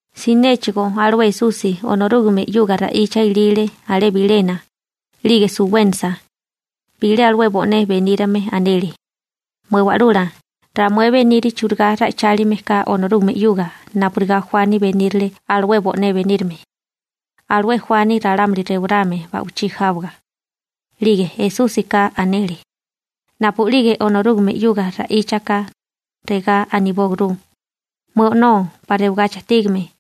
Sinéchigo alué Esusi Onorúgame 'yuga ra'icha ilile alé bilena, 'lige suwénasa, bilé alué bo'né benírame anele: ―Mué Wa'lula, ramué beniri churigá ra'icháliame ka Onorúgame 'yuga napurigá Juani benírale alué bo'né benírame, alué Juani ralámuli rewarame ba'wichí jáwaga. 'Lige Esúsika anele: ―Napu'lige Onorúgame 'yuga ra'icha ka, regá anibóaguru: Mué O'nó 'pa rewagachi ajtígame.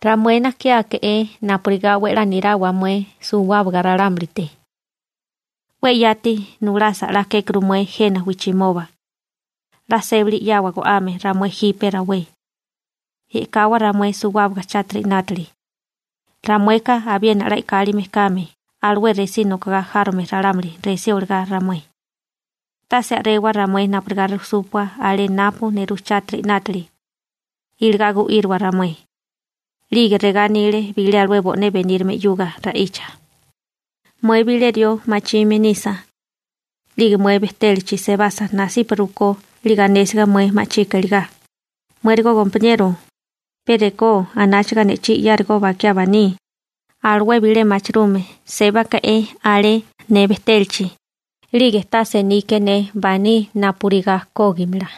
Ramué najkiáke'é napurigá 'we a'lá nirawa mué suwábaga ralámulite. 'We yati nulasa 'la kékuru mué jena wijchimoba. 'La sébali 'yawa go'ame ramué jipe rawé. E'kawa ramué suwábaga chátiri 'nátili, ramueka abiena 'la e'kálime kame alué resí nokogá járome ralámuli resí olagá ramué. Tase a'rewa ramué napurigá rujsúpua alé napu nerú chátiri 'nátili, iligá gu'íriwa ramué. 'Lige regá anile bilé alué bo'né benírame 'yuga ra'icha: ―Mué bilé rió machime nisa, 'lige mué bejtélachi sebasa nasipa rukó 'lige anésiga mué ma'chika iligá: «Muérigo gompaniero, pe rekó anáchaga ne'chí 'yárigó bakiá baní, alué bilé machirume sébake'é alé ne bejtélachi, 'lige tase nike ne baní napurigá kógimala.»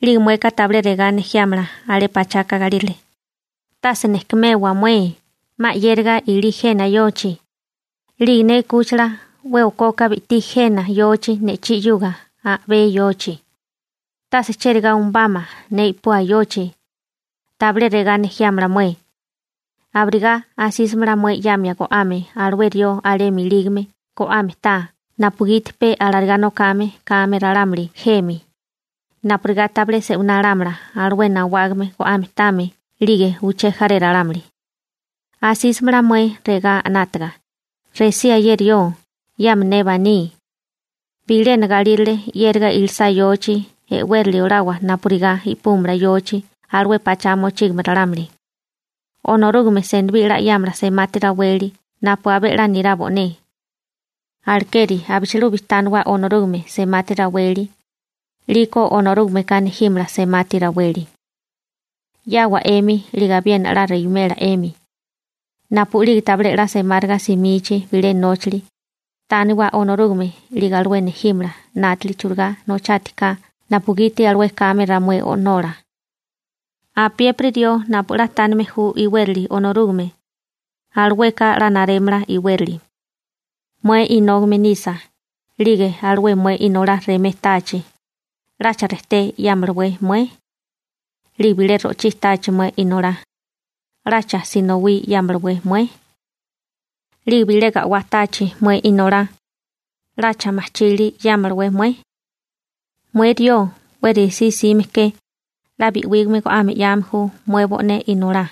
'Lige mueka tabilé regá nejiámala alé pachaka galírale: «Tase nejkumewa mué, 'ma 'yériga ilí jena yochi, 'lige ne 'kúchila 'we okoka bi'tí jena yochi ne'chí 'yuga a'bé yochi. Tase cherigá umubámala ne i'pua yochi.» Tabilé regá nejiámala mué. Abirigá asísimala mué 'yamia go'ame alué rió alemi ilígame go'ame taa napugiti pe alarigá nokame kame ralámuli jemi, napurigá tabilé se'winá lámala alué nawágame go'ame táame 'lige uché jaré ralámuli. Asísamala mué regá 'nátaga: «Resía ye rió, 'yama ne baní.» Bilena galírale 'yériga ilisá yochi, e'wérali olawa napurigá i'púmala yochi alué pachá mochígame ralámuli. › Onorúgame senibí 'la 'yámala semati raweli napu abé 'la nirá bo'né. Alekeri abichilubi tániwa Onorúgame semati raweli, 'liko Onorúgameka nejímala semati raweli. 'Yáawa 'emi 'lige abiena 'la rewimela 'emi. Napu'lige tabilé 'la semáriga simichi bilé nóchali, tániwa Onorúgame 'lige alué nejímala 'nátili churigá nochátiká napugiti alué kame ramué O'nola. Apiépiri rió napu 'la tánime ju iwérali Onorúgame, alueka 'la narémala iwérali. › Mué inógame nisa, 'lige alué mué inolá remé táachi, ¿'lacha rejté 'yámalawé mué? 'Lige bilé ro'chí táachi mué inolá, ¿'lacha sinowí 'yámalawé mué? 'Lige bilé ga'wá táachi mué inolá, ¿'lacha majchili 'yámalawé mué? Mué rió 'we resí 'sime ke, 'la bi'wígame go'ame 'yame ju mué bo'né inolá,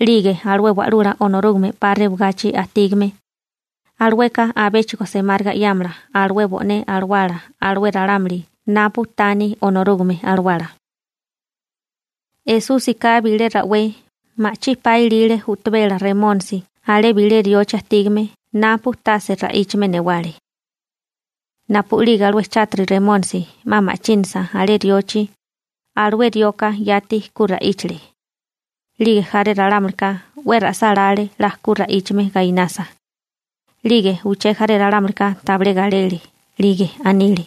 'lige alué Wa'lula Onorúgame 'pa rewagachi ajtígame, alueka abéchigo semáriga 'yámala alué bo'né alawala alué ralámuli napu taní Onorúgame Alawala. Esúsika bilé rawé ma'chí pa ilile u'tabela remónisi alé bilé riochi ajtígame napu tase ra'íchame newale. Napu'lige alué chátiri Remónisi 'ma ma'chínasa alé riochi, alué rioka yati ku ra'íchale. 'Lige jaré ralámulika 'we ra'sálále 'la ku ra'íchame gainasa. 'Lige uché jaré ralámulika tabilé galele, 'lige anile: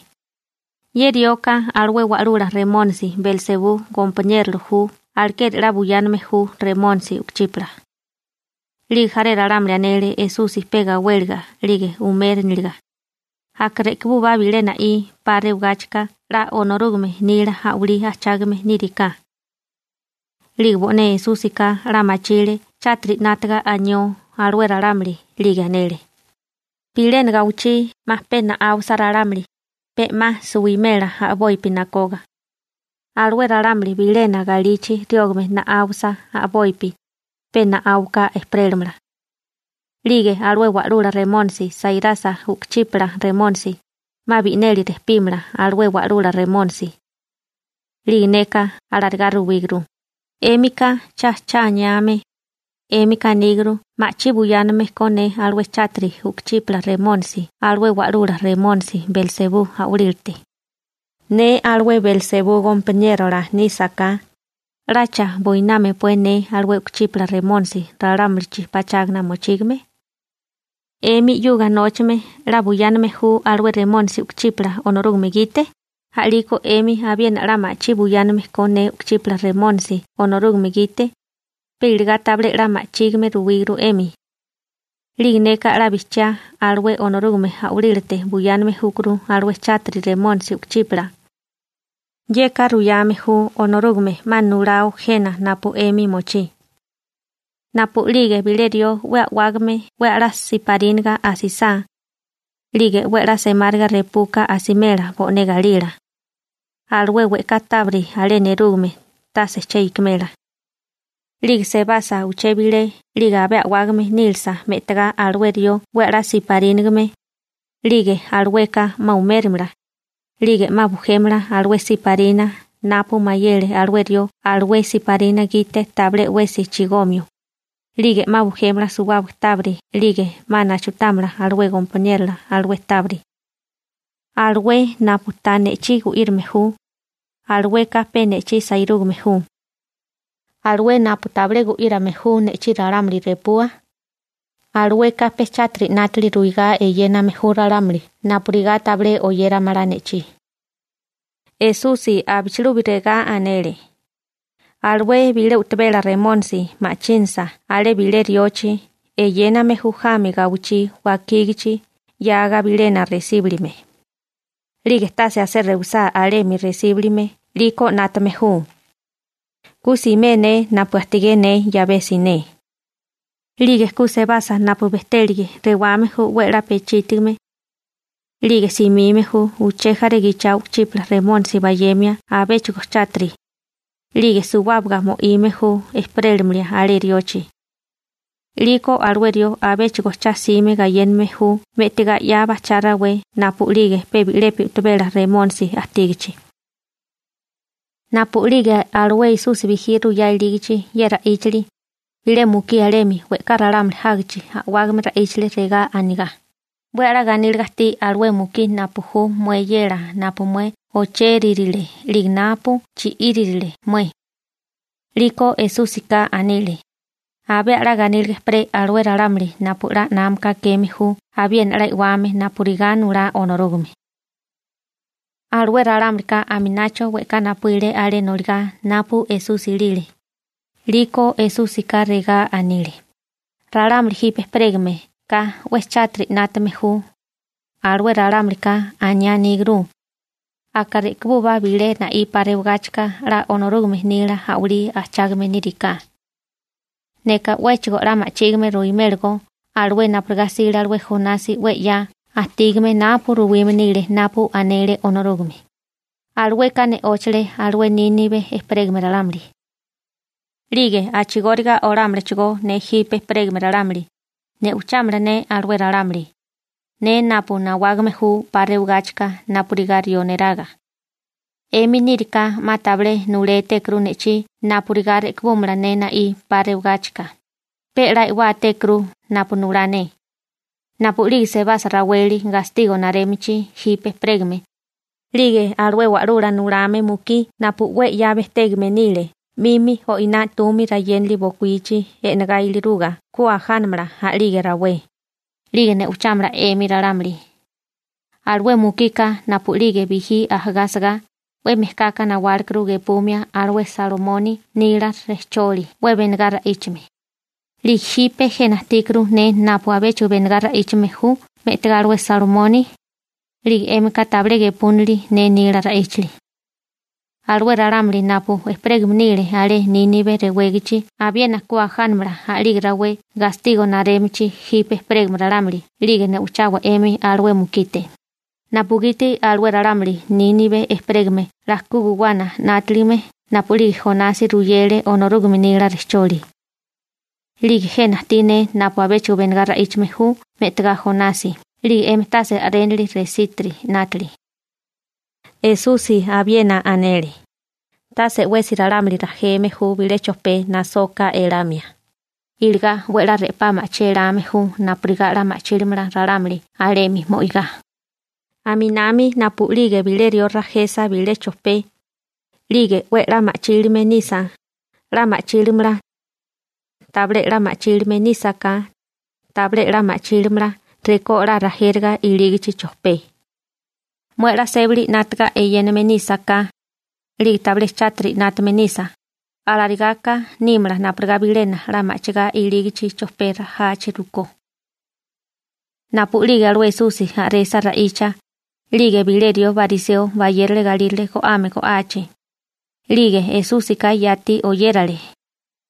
―Ye rioka alué wa'lula remónisi Belsebú gompaniérola ju alekeri 'la buyáname ju remónisi u'kuchípala. 'Lige jaré ralámuli anele Esusi pe gawéliga 'lige umériniliga: ―Aka re'kibúbá bilé na'í 'pa rewigáchika 'la Onorúgame nila a'walí ajchágame níriká. 'Lige bo'né Esúsika 'la machile chátiri 'nátaga anió alué ralámuli, 'lige anele: ―Bilena gawichí 'ma pe na'áwasa ralámuli, pe 'ma suwimela a'bopi nakoga. Alué ralámuli bilena galichi riógame na'áwasa a'bopi, pe na'áuka ejperélamala. 'Lige alué wa'lula remónisi sairasa u'kuchípala remónisi, 'ma bi'neli rejpímala alué wa'lula remónisi. 'Lige neka alarigá ruwíguru, 'émika cha cha aniame, 'émika aníguru ma'chí buyáname ko ne alué chátiri u'kuchípala remónisi alué wa'lula remónisi Belsebú a'walílate. Ne alué Belsebú gompaniérola nísaká, ¿'lacha buinámapué ne alué u'kuchípala remónisi ralámulichi pachágana mochígame? 'Emi 'yuga nóchame 'la buyáname ju alué remónisi u'kuchípala Onorúgame gite, a'lígeko 'emi abiena 'la machí buyáname ko ne u'kuchípala remónisi Onorúgame gite, pe iligá tabilé 'la ma'chígime ruwíguru 'emi. 'Lige neka 'la bijchiá alué Onorúgame a'walílate buyáname júkuru alué chátiri remónisi u'kuchípala. Yeka ruyame ju Onorúgame 'ma nulao jena napu 'emi mochí. › Napu'lige bilé rió 'we a'wágame 'we a'lá siparínaga asisá, 'lige 'we a'lá semáriga repuka asimela bo'né galila. Alué we'ká tábiri alé nerúgame tase che ikimela. 'Lige sebasa uché bilé 'lige abé a'wágame nílasa me'tagá alué rió 'we a'lá siparínagame, 'lige alueka 'ma umérimala, 'lige 'ma bujémala alué siparina napu mayele alué rió alué siparina gite tabilé 'wesi chigomio, 'lige 'ma bujémala suwábaga tábiri 'lige 'ma nachutámala alué gompaniérola alué tábiri. › Alué napu ta ne'chí gu'írame ju, alueka pe ne'chí sairúgame ju. Alué napu tabilé gu'írame ju ne'chí ralámuli repua, alueka pe chátiri 'nátili ruigá eyéname ju ralámuli napurigá tabilé oyéramala ne'chí. Esusi abichilubi regá anele: ―Alué bilé u'tabela remónisi ma'chínasa alé bilé riochi, eyéname ju jami gawichí wakígichi 'yaga bilena resíbulime, 'lige tase asé rewisá alemi resíbulime 'liko 'nátame ju: «Ku simé ne napu ajtigé ne 'yabé siné.» 'Lige ku sebasa napu bejtélige, rewame ju 'we a'lá pechítigame. 'Lige simime ju uché jaré gichao u'kuchípala remónisi bayemia abéchigo chátiri, 'lige suwábaga mo'ime ju ejperélimia alé riochi. 'Liko alué rió abéchigo cha 'sime gayéname ju me'tigá 'ya bajchá rawé napu'lige pe bi'lepi u'tabela remónisi ajtígachi. Napu'lige alué Esusi bijí ruyá ilígachi ye ra'íchali, bilé mukí alemi we'ká ralámuli jágichi a'wágame ra'íchale regá anigá: ―¡'We a'lá ganíliga ajtí alué mukí napu ju mué eyela napu mué ochéririle 'lige napu chi'íririle mué! 'Liko Esúsika anile: ―Abé a'lá ganíliga ejperé alué ralámuli napu 'la námaka akeme ju abiena 'la e'wame napurigá nulá Onorúgame. Alué ralámulika aminacho we'ká napuíle alé noligá napu Esusi ilile, 'liko Esúsika regá anile: ―Ralámuli jipe ejperégameká 'we chátiri 'nátame ju, alué ralámulika aniá aníguru: «Aka re'kibúbá bilé na'í 'pa rewigáchika 'la Onorúgame nila a'walí ajchágame níriká.» Neka 'wéchigo 'la ma'chígime ruimélagó alué napurigá 'sile alué Jonasi 'we 'ya ajtígame napu ruwime nile napu anele Onorúgame: Alueka ne'óchale alué Nínibe ejperégame ralámuli. 'Lige a'chigóriga olámalachigó ne jipe ejperégame ralámuli, ne'ochámala ne alué ralámuli, ne napu nawágame ju 'pa rewagáchika napurigá rió neraga. 'Emi níriká 'ma tabilé nulétékuru ne'chí napurigá re'kibúmala ne na'í 'pa rewagáchika, pe 'la e'wátékuru napu nulá ne. Napu'lige sebasa raweli gastigo narémichi jipe ejperégame, 'lige alué wa'lula nulame mukí napu 'we 'ya bejtégame nile 'mimi o'iná 'tumi rayénali bokuíchi e'negá iliruga ku ajánamala a'lige rawé, 'lige ne'ochámala 'emi ralámuli. Alué mukika napu'lige bijí ajagá asagá, 'we mejkaka nawálekuru gepumia alué Salomoni nila rejcholi 'we benegá ra'íchame, 'lige jipe jena ajtíkuru ne napu abéchigo benegá ra'íchame ju me'tigá alué Salomoni, 'lige 'émika tabilé gepúnili ne nila ra'íchali. Alué ralámuli napu ejperégame nile alé Nínibe rewégachi abiena ku ajánamala a'lige rawé gastigo narémichi jipe ejperégame ralámuli 'lige ne'ochawa 'emi alué mukite, napugiti alué ralámuli Nínibe ejperégame 'la ku guwana 'nátaligame napu'lige Jonasi ruyele Onorúgame nila rejcholi. 'Lige jena ajtí ne napu abéchigo benegá ra'íchame ju me'tagá Jonasi 'lige 'emi tase a'rénili resítiri 'nátili. Esusi abiena anele: ―Tase 'wesi ralámuli rajeme ju bilé chojpé nasoka elamia, iligá 'we a'lá re'pá ma'chí elame ju napurigá 'la ma'chílimala ralámuli alemi mo'igá. Aminami napu'lige bilé rió rajesa bilé chojpé, 'lige 'we a'lá ma'chílame nisa, 'la ma'chílimala. Tabilé 'la ma'chílame nísaká, tabilé 'la ma'chílimala rekó 'la rajériga ilígichi chojpé. Mué 'la sébali 'nátaga inásaká, 'lige tabilé chátiri 'nátame nisa mué, alarigáká nímala napurigá bilena 'la ma'chigá ilígachi chojpé rajachi rukó. Napu'lige alué Esusi a'resa ra'icha, 'lige bilé rió bariseo bayérale galírale go'ame go'achi. 'Lige Esúsika yati oyérale,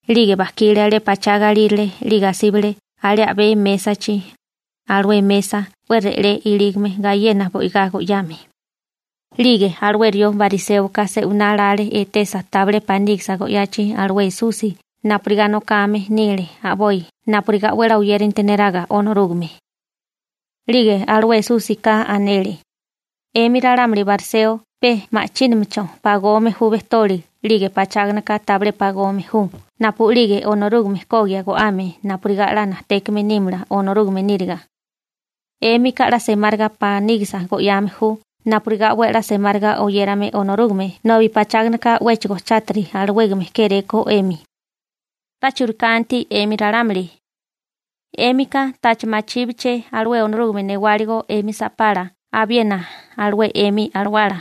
'lige bajkile alé pachá galírale 'lige asíbale alé a'bé mésachi, alué mesa 'we re'lé ilígame gayena bo'igá go'yame. 'Lige alué rió bariséoka se'winá lale etesa tabilé panígisa go'yachi alué Esusi napurigá nokame nile a'boi napurigá 'we a'lá oyéranti neraga Onorúgame. 'Lige alué Esúsika anele: ―'Emi ralámuli bariseo pe ma'chíminachó pagome ju bejtoli 'lige pacháganaka tabilé pagome ju napu'lige Onorúgame kogia go'ame napurigá 'la najtékame nímala Onorúgame níriga. 'Émika 'la semáriga panígisa go'yame ju napurigá 'we a'lá semáriga oyérame Onorúgame nobi pacháganaka 'wéchigo chátiri alawégame kéré ko 'emi. ¡'La churikanti 'emi ralámuli! 'Émika ¿tacha machíbeché alué Onorúgame newáligo 'emi sa'pala abiena alué 'emi alawala?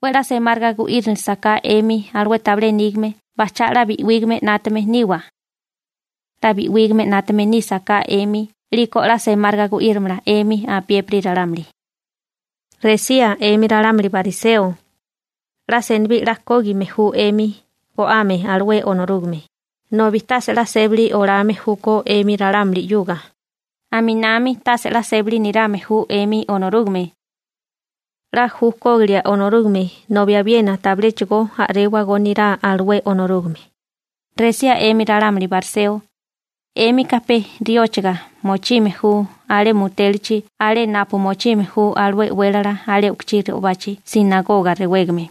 'We 'la semáriga gu'írinilisaká 'emi alué tabilé nígame bajchá 'la bi'wígame 'nátame niwa. 'La bi'wígame 'nátame nísaká 'emi 'liko 'la semáriga gu'írimala 'emi apiépiri ralámuli. › Resía 'emi ralámuli bariseo, 'la senibí 'la kógime ju 'emi go'ame alué Onorúgame, nobi tase 'la sébali olame júkó 'emi ralámuli 'yuga, aminami tase 'la sébali nirame ju 'emi Onorúgame. 'La ju kógilia Onorúgame nobi abiena tabiléchigo a'réwagó nirá alué Onorúgame. › Resía 'emi ralámuli bariseo, 'émika pe rióchaga mochime ju alé mutélachi alé napu mochime ju alué e'wélala alé u'kuchí re'obachi «sinagoga» rewégame,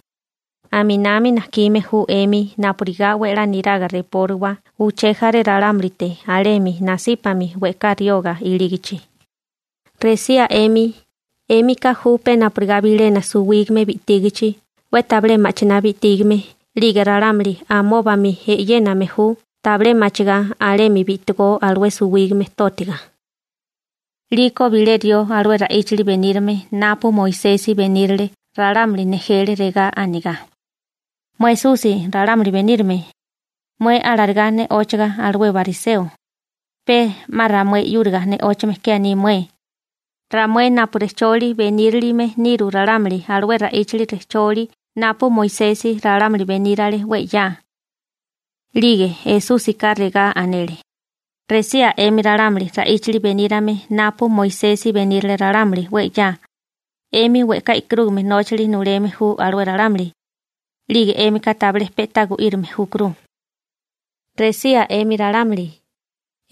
aminami najkime ju 'emi napurigá 'we a'lá niraga repóriwa uché jaré ralámulite alemi nasípami we'ká rioga ilígichi. › Resía 'emi, 'émika ju pe napurigá bilena suwígame bi'tígichi 'we tabilé ma'chiná bi'tígame 'lige ralámuli amóbami e'yéname ju tabilé machigá alemi bi'tigó alué suwígame tótiga. 'Liko bilé rió alué ra'íchali benírame napu Moisesi benírale ralámuli nejele regá anigá: ―Mué Esusi ralámuli benírame, mué alarigá ne'óchaga alué bariseo, pe 'ma ramué 'yúriga ne'óchame ke aní mué, ramué napu rejcholi benírilime niru ralámuli alué ra'íchali rejcholi napu Moisesi ralámuli benírale 'we 'ya. 'Lige Esúsika regá anele: ―Resía 'emi ralámuli ra'íchali benírame napu Moisesi benírale ralámuli 'we 'ya, 'emi we'ká e'karúgame nóchali nuleme ju alué ralámuli, 'lige 'émika tabilé pe'tá gu'írame júkuru. › Resía 'emi ralámuli,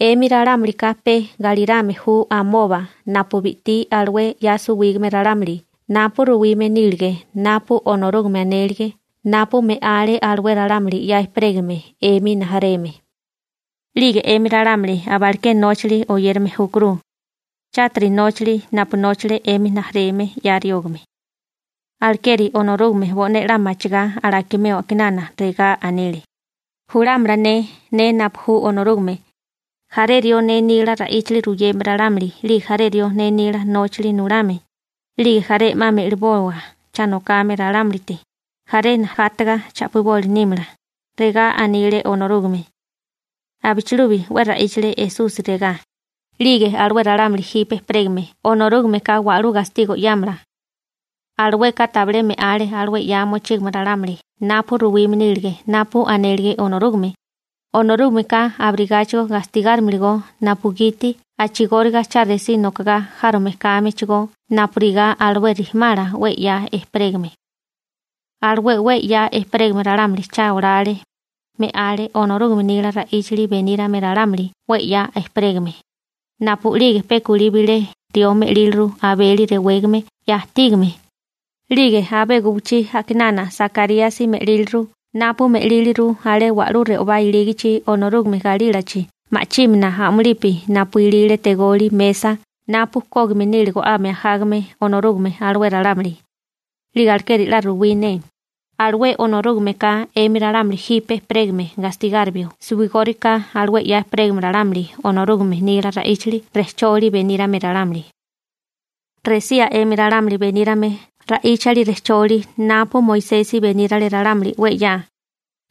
'emi ralámulika pe galírame ju amoba napu bi'tí alué 'ya suwígame ralámuli napu ruwime nílige napu Onorúgame anélige napu me'ale alué ralámuli 'ya ejperégame 'emi rijimala. 'Lige 'emi ralámuli abalaké nóchali oyérame júkuru, chátiri nóchali napu nóchale 'emi rijimala 'ya riógame. › Alekeri Onorúgame bo'né 'la machigá alakimeo a'kinana regá anile: «Julámala ne, ne napu ju Onorúgame, jaré rió ne nila ra'íchali ruyeme ralámuli 'lige jaré rió ne nila nóchali nulame, 'lige jaré 'ma me'liboa cha nokame ralámulite, jaré najátaga cha'piboli nímala», regá anile Onorúgame. Abichilubi 'we ra'íchale Esusi regá: ―'Lige alué ralámuli jipe ejperégame Onorúgameka wa'lú gastigo 'yámala. Alueka tabilé me'ale alué 'ya mochígame ralámuli napu ruwime nílige napu anélige Onorúgame, Onorúgameka abirigáchigo gastigárimalagó napugiti a'chigóriga cha resí nokagá járome kámechigó napurigá alué rijimala 'we 'ya ejperégame. Alué 'we 'ya ejperégame ralámuli cha olale, me'ale Onorúgame nila ra'íchali benírame ralámuli 'we 'ya ejperégame, napu'lige pe kulí bilé rió me'líliru Abeli rewégame 'ya ajtígame, 'lige abé guwichí a'kinana Sakaríasi me'líliru napu me'líliru alé wa'lú re'obá ilígichi, Onorúgame galílachi ma'chímana a'mulipi napu ilile tegoli mesa napu kógime nile go'ame ajágame Onorúgame alué ralámuli. 'Lige alekeri 'la ruwí ne, alué Onorúgameka 'emi ralámuli jipe ejperégame gastigárimio suwigóriká alué 'ya ejperégame ralámuli Onorúgame nila ra'íchali rejcholi benírame ralámuli. › Resía 'emi ralámuli benírame ra'íchali rejcholi napu Moisesi benírale ralámuli 'we 'ya,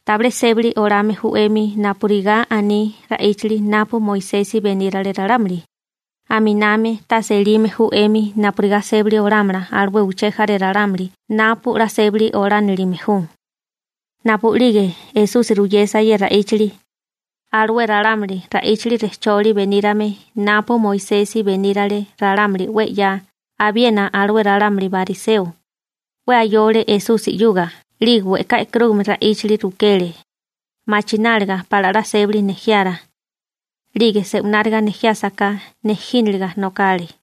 tabilé sébali olame ju 'emi napurigá aní ra'íchali napu Moisesi benírale ralámuli, aminami tase elime ju 'emi napurigá sébali olámala alué uché jaré ralámuli napu 'la sébali olánilime ju. Napu'lige Esusi ruyesa ye ra'íchali, alué ralámuli ra'íchali rejcholi benírame napu Moisesi benírale ralámuli 'we 'ya abiena alué ralámuli bariseo, 'we ayole Esusi 'yuga 'lige we'ká e'karúgame ra'íchali rukele, machináliga pala 'la sébali nejiara, 'lige se'wináriga nejiásaká nejínaliga nokale.